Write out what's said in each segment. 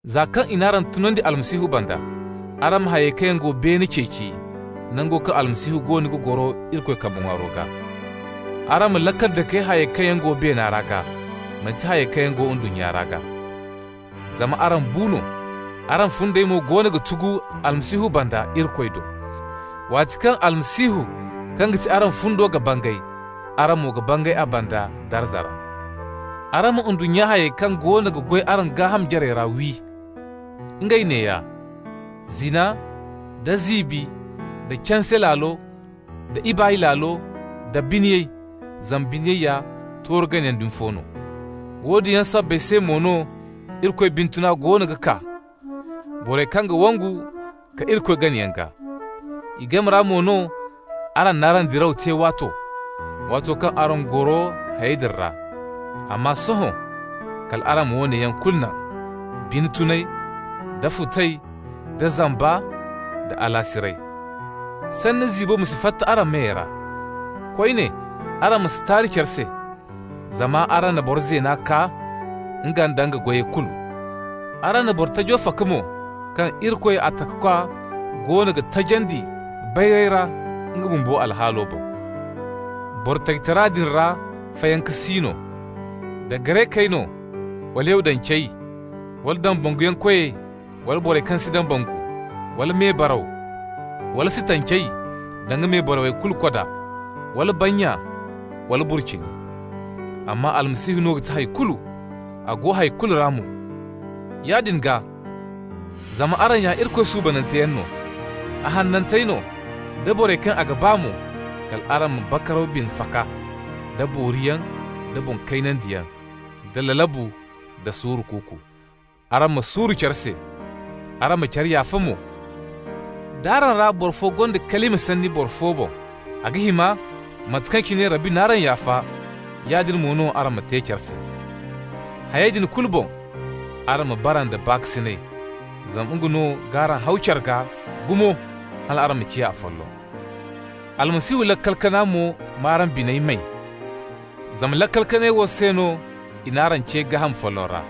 Za kaŋ i n'araŋ tunandi Almasihu banda, araŋ ma hayey kaŋ yaŋ go beene ceeci, nango kaŋ Almasihu goono ga goro Irikoy kambe ŋwaaro gaa. Araŋ ma laakal dake hayey kaŋ yaŋ go beena ra gaa, manti hayey kaŋ yaŋ go ndunnya ra gaa. Zama araŋ bu no. Araŋ fundey mo goono ga tugu Almasihu banda Irikoy do. Waati kaŋ Almasihu kaŋ ga ti araŋ fundo ga bangay, araŋ mo ga bangay a banda darza ra. Araŋ ma ndunnya hayey kaŋ goono ga goy araŋ gaaham jarey ra wi. Ngey neeya: zina, da ziibi, da canse laalo, da ibaay laalo, da biniyay (zama biniyay ya tooru ganayaŋ dumi fo no). Woodin yaŋ sabbay se mo no Irikoy bine tuna goono ga kaa borey kaŋ ga wangu ka Irikoy gana yaŋ gaa. I game ra mo no araŋ n'araŋ diraw te waato, waato kaŋ araŋ goro hayey din ra. Amma sohõ, kal araŋ ma woone yaŋ kulu naŋ: bine tunay, da futay, da zamba, da alaasiray. Sanni ziibo mo ma si fatta araŋ meyey ra. Koyne, araŋ ma si taari care se, zama araŋ na boro zeena kaa, nga nda nga goyey kulu. Araŋ na boro tajo faka mo kaŋ Irikoy, a Takakwa, goono ga tajandi bayray ra nga bumbo alhaalo boŋ. Boro tajitara din ra fayanka si no: da Garekey no wala Yahudancey, da dambanguyankoy wala boro kaŋ si dambangu, wala mebaraw, wala Sitancey (danga mebaraw kulu koda), wala bannya, wala burcini. Amma Almasihu no ga ti hay kulu, a go hay kulu ra mo. Yaadin gaa, zama araŋ ya Irikoy suubananteyaŋ no, a hanantey no, da borey kaŋ a ga ba mo, kal araŋ ma bakaraw bine faka, da booriyaŋ, da boŋ kaynandiyaŋ, da lalabu, da suuru kuuku. Araŋ ma suuru care se, araŋ ma care yaafa mo. D'araŋ ra boro fo gonda kalima sanni boro fo boŋ, a ga hima, mate kaŋ cine Rabbi n'araŋ yaafa, yaadin mo no araŋ ma te care se. Hayey din kulu boŋ, araŋ ma bara nda baakasinay, zama nga no g'araŋ haw care gaa gumo hal araŋ ma ciya afolloŋ. Almasihu laakal kana mo m'araŋ biney may, zama laakal kanay wo se no i n'araŋ ce gaaham folloŋ ra.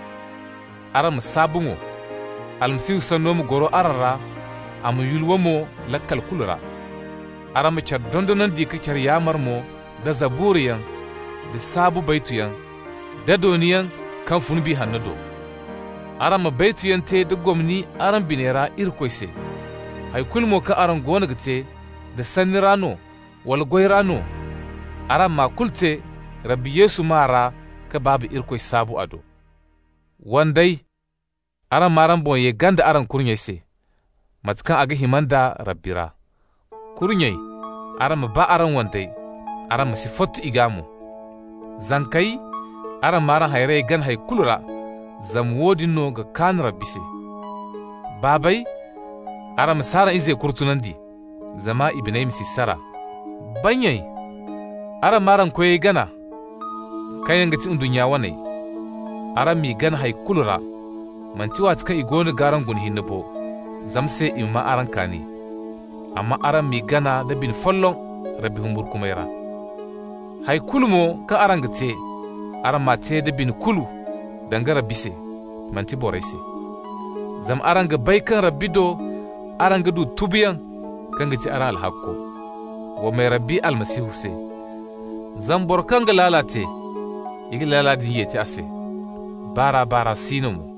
Araŋ ma saabu mo. Almasihu sanno ma goro araŋ ra, a ma yulwa mo laakal kulu ra. Araŋ ma care dondonandi ka care yaamar mo da Zaburayaŋ da saabu baytuyaŋ da dooniyaŋ kaŋ fun Biya Hanno do. Araŋ ma baytuyaŋ te da gomni araŋ biney ra Irikoy se. Hay kulu mo kaŋ araŋ goono ga te, da sanni ra no wala goy ra no, araŋ m'a kulu te Rabbi Yesu maa ra ka Baaba Irikoy saabu a do. Wandey, araŋ m'araŋ boŋ ye ganda araŋ kurnyey se, mate kaŋ a ga hima nd'a Rabbi ra. Kurnyey, araŋ ma ba araŋ wandey, araŋ ma si fottu i gaa mo. Zankey, araŋ m'araŋ hayrey gana hay kulu ra, zama woodin no ga kaan Rabbi se. Baabey, araŋ ma si araŋ izey kurtunandi, zama i biney ma si sara. Bannyey, araŋ m'araŋ koyey gana, kaŋ yaŋ ga ti ndunnya waney. Araŋ m'i gana hay kulu ra, manti waati kaŋ i goono g'araŋ guna hinne bo, zama se i ma maa araŋ kaani. Amma araŋ m'i gana nda bine folloŋ Rabbi humburkumay ra. Hay kulu mo kaŋ araŋ ga te, araŋ m'a te da bine kulu, danga Rabbi se, manti borey se. Zama araŋ ga bay kaŋ Rabbi do araŋ ga du tubuyaŋ kaŋ ga ti araŋ alhakko. Wa may Rabbi Almasihu se! Zama boro kaŋ ga laala te, i ga laala din yeti a se. Baar'a-baar'a si no mo.